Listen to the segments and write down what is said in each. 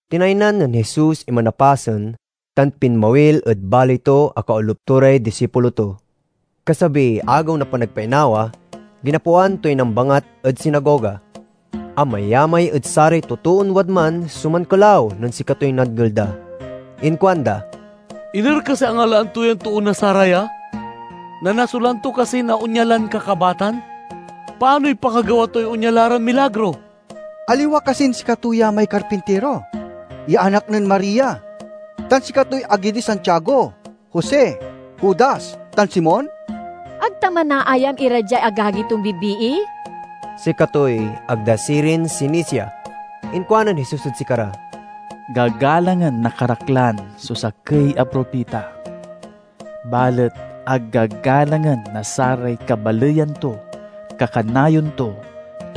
Tinaynan nen Jesus iman a pasen, tan pinmawil ed baley to a kaolup to ray disipulo to. Kasabiy Agew na Panagpainawa, ginapoan toy nambangat ed sinagoga. Amayamay ed saray totoon wadman so mankelaw nen sikatoy nadngel da. Inkuanda, "Iner kasiy angalaan to yan too na saraya? Nanasulan to kasi na onya lan kakabatan? Panoy pakagawa toy onya la ran milagro? Aliwa kasin sikato ya may karpintiro, ya anak nen Maria, tan sikatoy agi di Santiago, Jose, Judas, tan Simon? Ag ta manaayam ira diay agagi ton bibii?" Sikatoy ag da sirin sinisia. Inkuanen Jesus ed sikara, "Gagalangen na karaklan so sakey a propita, balet ag gagalangen na saray kabaleyan to kakanayon to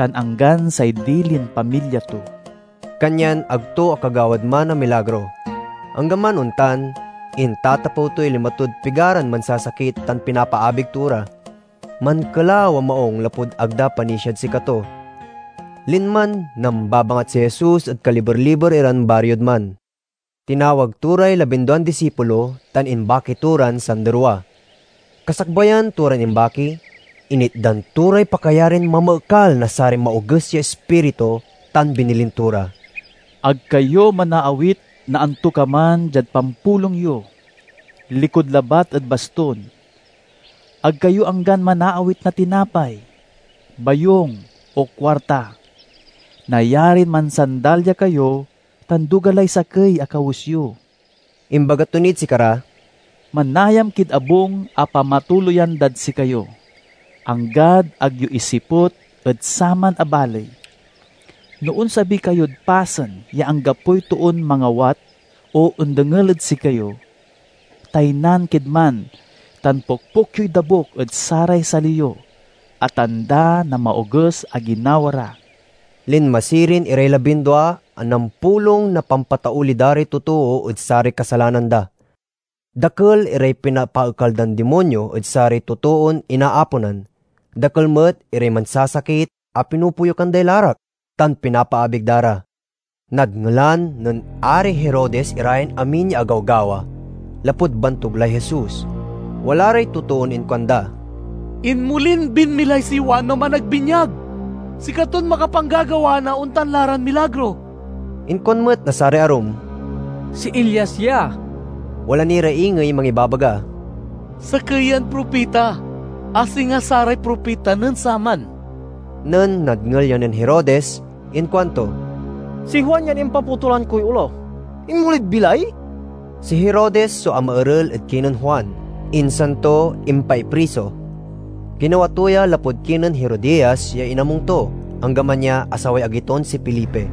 tan anggan say dilin pamilya to." Kanyan ag to akagawad man na milagro. Anggaman ontan, intatapew toy lima tod pigaran mansasakit tan pinapaabig to ra. Mankelaw a maung lapud ag da panisiad sikato. Linman nambabangat si Jesus ed kaliber-liber iran bariod man. Tinawag to ray labinduan disipulo tan imbaki to ran sanderwa. Kasakbayan to ran imbaki, initdan to ray pakayarin mamaekal na saray maoges ya ispiritu tan binilin to ra, "Ag kayo manaawit na antokaman diad pampulong yo, likud labat ed baston. Ag kayo anggan manaawit na tinapay, bayung, o kuarta. Nayarin mansandalya kayo, tan duga lay sakey a kawes yo." Imbaga to nid sikara, "Manayam kid abung a pamatuloyan dad sikayo, anggad ag yo isiput ed saman a baley. No onsabi kayod pasen ya anggapoy toon mangawat o ondengel ed sikayo, taynan kid man tan pokpok yoy dabuk ed saray sali yo, a tanda na maoges a ginawa ra." Linma sirin iray labindua a nampulong na pampatauli da ray totoo ed saray kasalanan da. Dakel iray pinapaekal dan dimonyo ed saray totoon inaaponan. Dakel met iray mansasakit a pinopoyukan day larak, tan pinapaabig da ra. Nadngelan nen Ari Herodes ira yan amin ya agawgawa, lapud bantug lay Jesus. Wala ray totoon inkuanda, "Inmolin binmilay si Juan a Managbinyag! Sikaton makapanggagawa na ontan la ran milagro." Inkuan met na saray arum, "Si Elias ya." Wala ni ra ingey mangibabaga, "Sakey yan propita, a singa saray propita nen saman." Nen nadngel ya nen Herodes, inkuanto, "Si Juan yan impapotulan koy olo. Inmolid bilay!" Si Herodes so amaerel ed kinen Juan, insan to impaipriso. Ginawa to ya lapud kinen Herodias ya inamung to, anggaman ya asaway agi ton si Felipe.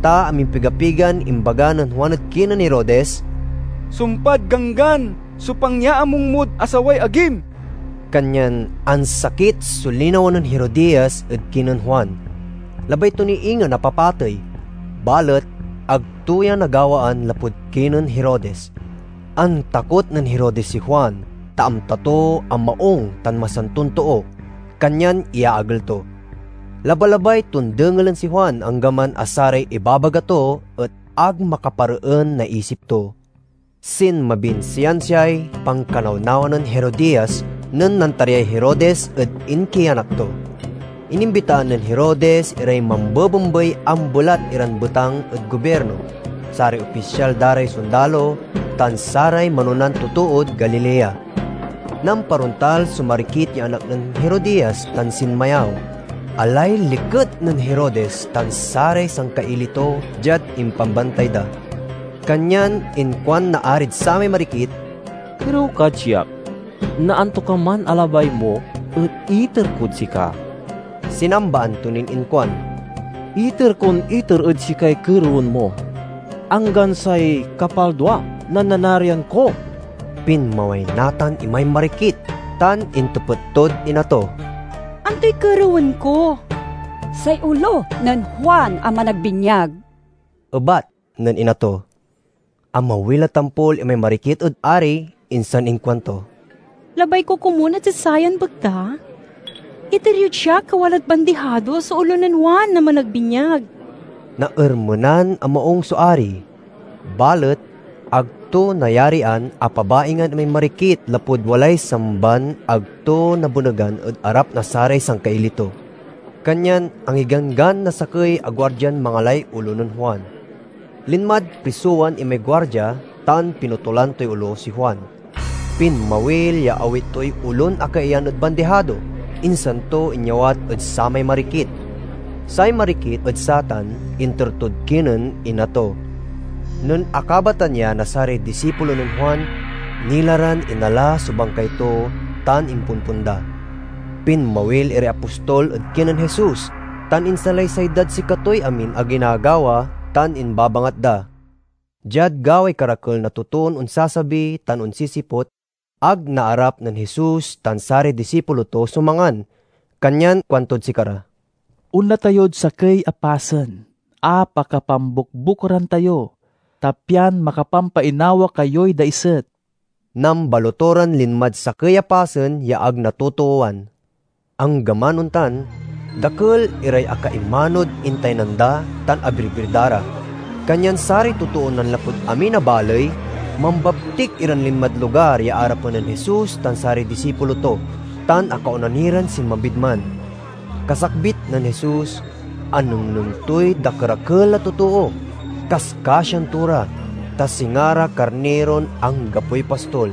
Ta amimpiga-pigan imbaga nen Juan ed kinen Herodes, "Sumpad ganggan so pangyaamung mod asaway agim!" Kanyan ansakit so linawa nen Herodias ed kinen Juan. Labay to ni ingen a papatey, balet ag to ya nagawaan lapud kinen Herodes. Antakot nen Herodes si Juan, ta amta to a maung tan masanton too, kanyan iyaagel to. Labalabay ton dengelen si Juan, anggaman a saray ibabaga to et ag makapareen na isip to. Sinmabin siansiay pankanawnawa nen Herodias nen nantaryay Herodes ed inkianak to. Inimbitaan nen Herodes iray mambebembay ambelat iran betang ed gobirno, saray opisyal da ray sondalo, tan saray manonan totood Galilea. Namparontal so marikit ya anak nen Herodias tan sinmayaw. Alay liket nen Herodes tan saray sangkaili to diad impambantay da. Kanyan inkuan na arid samay marikit, "Kerew kad siak na antokaman a labay mo et iter kod sika." Sinambaan to nin inkuan, "Iter kon iter ed sikay kerewen mo, anggan say kapaldua na nanarian ko!" Pinmaway natan imay marikit tan intepet tod ina to, "Antoy kerewen ko?" "Say olo nen Juan a Managbinyag," ebat nen ina to. Amawil a tampol imay marikit ed ari, insan inkuanto, "Labay ko komun a diad sayan bekta, iter yod siak a walad bandihado so olo nen Juan a Managbinyag!" Naermenan a maung so ari, balet ag to nayarian a pabaingan imay marikit lapud walay samban ag to nabenegan ed arap na saray sangkaili to. Kanyan angiganggan na sakey a guardian mangalay olo nen Juan. Linmad prisowan imay guardia tan pinutolan toy olo si Juan. Pinmawil ya awit toy olon akaiyan ed bandihado, insan to inyawat ed samay marikit. Say marikit ed satan inter tod kinen ina to. Nen akabatan ya na saray disipulo nen Juan, nila ran inala so bangkay to tan impompon da. Pinmawil iray apostol ed kinen Jesus tan insalaysay dad sikatoy amin a ginagawa tan imbabangat da. Diad gaway karakel na totoon onsasabi tan onsisiput, ag naarap nen Jesus tan saray disipulo to so mangan. Kanyan kuantod sikara, "Onla tayod sakey a pasen a pakapambukbukoran tayo, ta pian makapampainawa kayoy daiset." Nambaloto ran linmad sakey a pasen ya ag natotoowan. Anggaman ontan, dakel iray akaimanod intaynan da tan abirbir da ra. Kanyan saray totoon nanlapud amin a baley mambabtik iran linmad lugar ya arapen nen Jesus tan saray disipulo to, tan akaona ni ran sinmabid man. Kasakbit nen Jesus, anengneng toy dakerakel a totoo. Kaskasian to ra, ta singa ra karniron anggapoy pastol.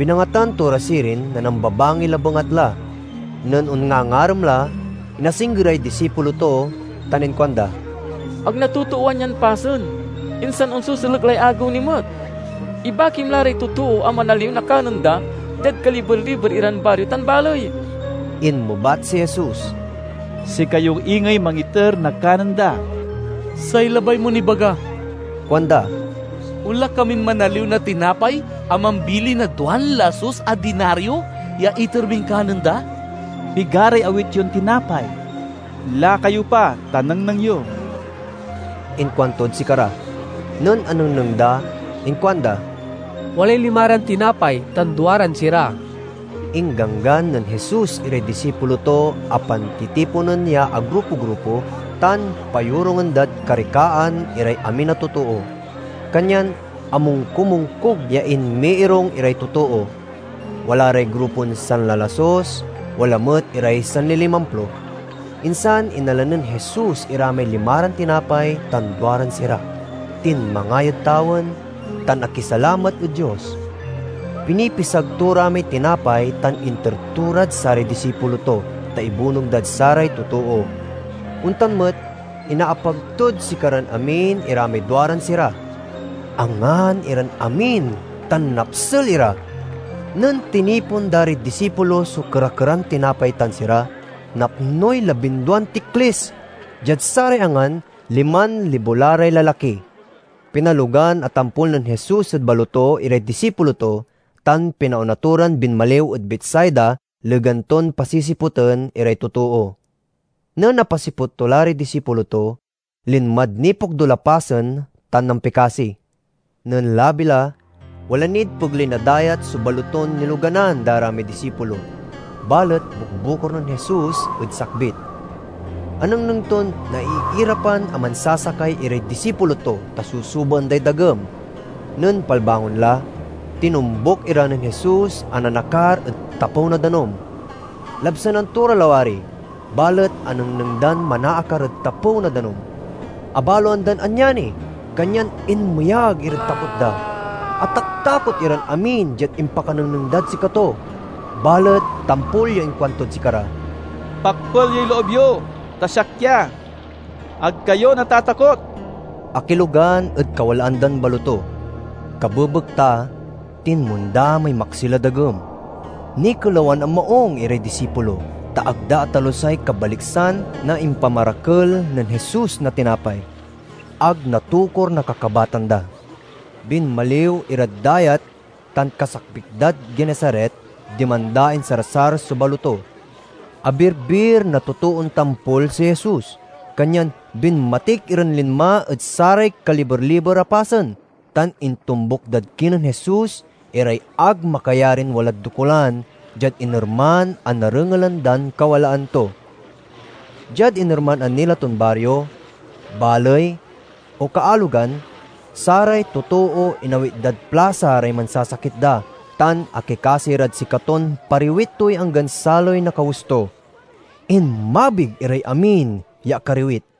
Binangatan to ra sirin na nambabangil a bengatla. Nen onngangarem la, inasinggeray disipulo to tan inkuanda, "Ag natotoowan yan pasen, insan onseselek lay agew ni met. Ibakim la ray totoo a manaliw na kanen da diad kaliber-liber iran bario tan baley." Inmebat si Jesus, "Sikayo ingey mangiter na kanen da." "Say labay mon ibaga," kuanda, "onla kamin manaliw na tinapay a mambili na duan lasus a dinario ya iter min kanen da?" "Pigaray awit yon tinapay? Lakayo pa ta nengneng yo," inkuantod sikara. Nen anengneng da inkuanda, "Walay limaran tinapay tan duaran sira." Ingganggan nen Jesus iray disipulo to a pantitiponen ya agrupo-grupo tan payorungen dad karikaan iray amin a totoo. Kanyan amongkumongkug ya inmiirung iray totoo. Wala ray grupon sanlalasus, wala met iray sanlilimamplo. Insan inala nen Jesus ira may limaran tinapay tan duaran sira, tinmangay ed tawen, tan akisalamat ed Dios. Pinipisag to ra may tinapay tan inter to rad saray disipulo to, ta ibunog dad saray totoo. Ontan met, inaapag tod sikaran amin ira may duaran sira. Angan iran amin tan napsel ira. Nen tinipon da ray disipulo so kera-keran tinapay tan sira, napnoy labinduan tiklis. Diad saray angan, liman libo la ray lalaki. Pinalogan a tampol nen Jesus ed baloto iray disipulo to tan pinaona to ran binmaliw ed Betsaida, legan ton pasisiputen iray totoo. Nen apasiput to la ray disipulo to, linmad nipokdul a pasen tan nampikasi. Nen labi la, wala nid pegley na dayat so baloton niloganan da ra may disipulo, balet bukbukor nen Jesus ed sakbit. Anengneng ton naiirapan a mansasakay iray disipulo to, ta susubaen day dagem. Nen palbangon la, tinombuk ira nen Jesus a nanakar ed tapew na danum. Labsanan to ra lawari, balet anengneng dan manaakar ed tapew na danum. Abaloan dan anyani, kanyan inmeyag irad takot da. Ataktakot iran amin diad impakanengneng dad sikato. Balet tampol ya inkuantod sikara, "Pakpel yoy loob yo, ta siak ya. Ag kayo natatakok!" Akilogan ed kawalaan dan baloto. Kabebekta, tinmonda may maksil a dagem. Nikelawan a maung iray disipulo, ta ag da atalusay kabaliksan na impamarakel nen Jesus na tinapay; ag natokur na kakabatan da. Binmaliw irad dayat tan kasakbit dad Genesaret, diman da insarsar so baloto. Abirbir na totoon tampol si Jesus. Kanyan binmatik iran linma ed saray kaliber-liber a pasen, tan intombuk dad kinen Jesus iray ag makayarin walad dokulan diad inerman a narengelan dan kawalaan to. Diad inerman a nila ton bario, baley, o kaalogan, saray totoo inawit dad plasa ray mansasakit da, tan akikasi rad sikaton pariwit toy anggan saloy na kawes to. Inmabig iray amin ya akariwit.